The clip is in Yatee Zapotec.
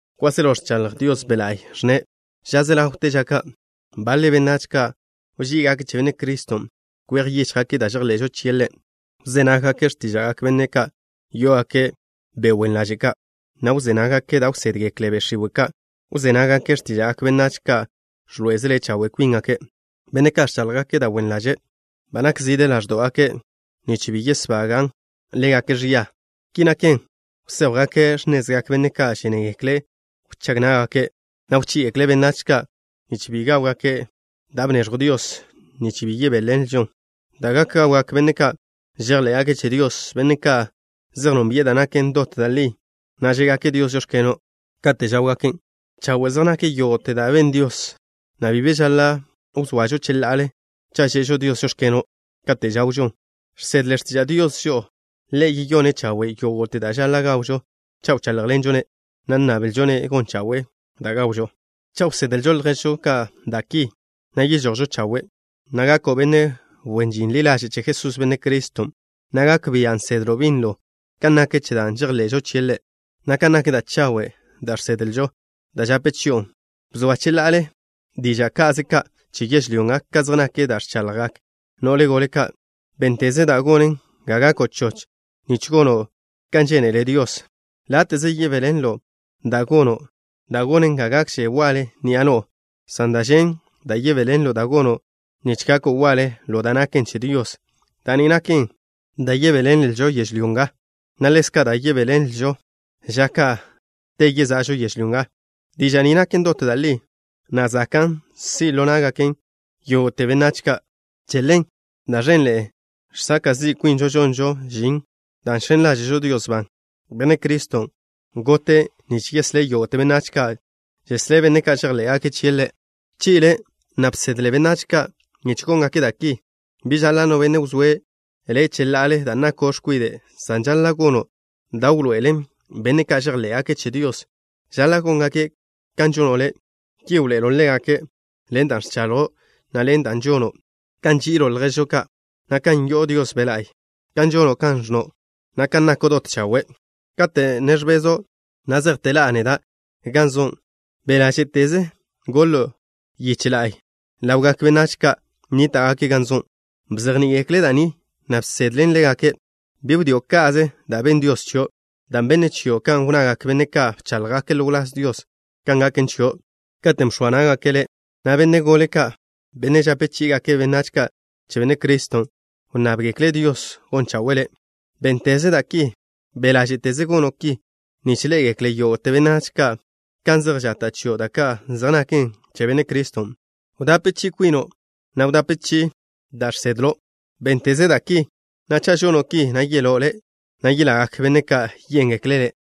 Kwáselo ẕchaḻj Dios Be' La'y, ẕnne': “Ža ze ḻawte ža ka' baḻe benách ka' wží'igake' che Benne' Criston'.” Kwej yíchjgake' da' žejḻe'žo chie' Ḻe'. Wzé nággake' x̱tíža'gak benne' ka' yó'ogake' be' wen ḻaže' ka', na' wzé nággake' da' wsédgekle be' x̱iwe' ka'. Wzé nággake' x̱tíža'gak benách ka' ẕḻoé'ezele chawe' kwíngake', benne' ka' ẕcháḻjgake' da' wen ḻaže'. Ba nzid ḻáẕdo'gake' nich bi yesbagan' ḻégake' ẕia. Ki naken, wséjwgake' x̱nezgak benne' ka' žénegekle' wchág ná'gake', na' wchí'igekle' benách ka' nich bi gáwgake' da' bneẕjw Dios nich yebéḻenlžon, da' gak gawgak benne' ka' žejḻé'gake' che Dios, benne' ka' zej nónbi'e da' naken dot da' li, na' žé'gake' Dios: “Žóx̱keno'” kate' žáwgaken'. Chawe' zej nak yógo'te da' ben Dios, na' bi be žaḻa' wzoažo cheḻa'ale cha' že'žo Dios: “Žóx̱keno'” kate' žawžon. Žsedle x̱tiža' Dios žo'o, Ḻe' yeyone' chawe' yógo'te da' žaḻa' gawžo cha' wcháḻjḻenžo-ne', na' nnablžo-ne' gon chawe'e da' gawžo. Cha' wsedlo' lježžo ka' da' ki, na' yežojo' chawe', na' gako' benne' wen žin ḻi ḻaže' che Jesús, Benne' Criston', na' gak bia' nsedlo' binlo kan nak che da' žejḻe'žo chie' Ḻe', na' kan nak da' chawe' da' žsedlžo, da' žape chi'on. Bzoa cheḻa'ale diža' ka'ze ka' che yežlyó nga kan zej nak da' ẕchaḻjgak no'le gole ka'. Bénteze da' gonen ga gako' choch nich gono' kan žénele Dios. Láte'ze yebéḻenlo' da' gono' da' gonen ga gakže waḻe ni'a no'o, san da' ẕen da' yebéḻenlo' da' gono' nich gako' waḻe ḻo da' naken che Dios. Da' ni naken da' yebéḻenlžo yežlyó nga, na' ḻezka' da' yebéḻenlžo ža ka' te yeza'žo yežlyó nga. Diža' ni naken dot da' li, na' zakan' si' ḻo ná'gaken yógo'te benách ka'. Che ḻen, da' ẕenḻe'e žsaka' zi' kwinžo žonžo žin, dan' žx̱en ḻáže'žo Dios ban. Benne' Criston' gote' nich yeslé' yógo'te benách ka'. Žeslé' benne' ka' žejḻé'gake' chie' Ḻe'. Bchi'le, na' bsedle benách ka' nich góngake' da' ki. Bi žaḻa' no benne' wzóe' le' cheḻa'ale dan' nako' x̱kwide', san žaḻa' gono' da' wḻoe'elen benne' ka' žejḻé'gake' che Dios žaḻa' góngake' kan žono' le'. Ki wḻoe'elo' ḻégake': Ḻen da' ẕchaḻjo', na' ḻen da' žono', kan nži'ilo' lježo' ka', na' kan yo'o Dios Be' La'y, kan žono' kan ẕnno', na' kan nako' dot chawe'. Kate' ne ẕbezo' na' zejte ḻa'a neda' gan zo', be' ḻáže'teze goḻo' yiche la'y ḻawgak benách ka' nníta'gake' gan zo'. Bzejní'i-gekle' da' ni, na' bsedlen ḻégake'. Bi wdío' ka'ze da' benn Dios chio', dan' benne' chio' kan wnnagak benne' ka' bcháḻjgake' ḻo wláz Dios kan gaken chio', katen' bx̱oa ná'gake' le', na' benne' gole ka', benne' žape chí'igake' benách ka' che Benne' Criston', wnnábgekle' Dios gon chawe'e le'. Bénteze da' ki. Be' ḻáže'teze gono' ki, nich ḻé'egekle yógo'te benách ka' kan zej žata' chio' da' ka' zej naken che Benne' Criston'. Wdape chi'i kwino', na' wdape chi'i da' žsedlžo. Bénteze da' ki, na' cha' žono' ki, na' yeló' le', na' yelagak benne' ka' yéngekle' le'.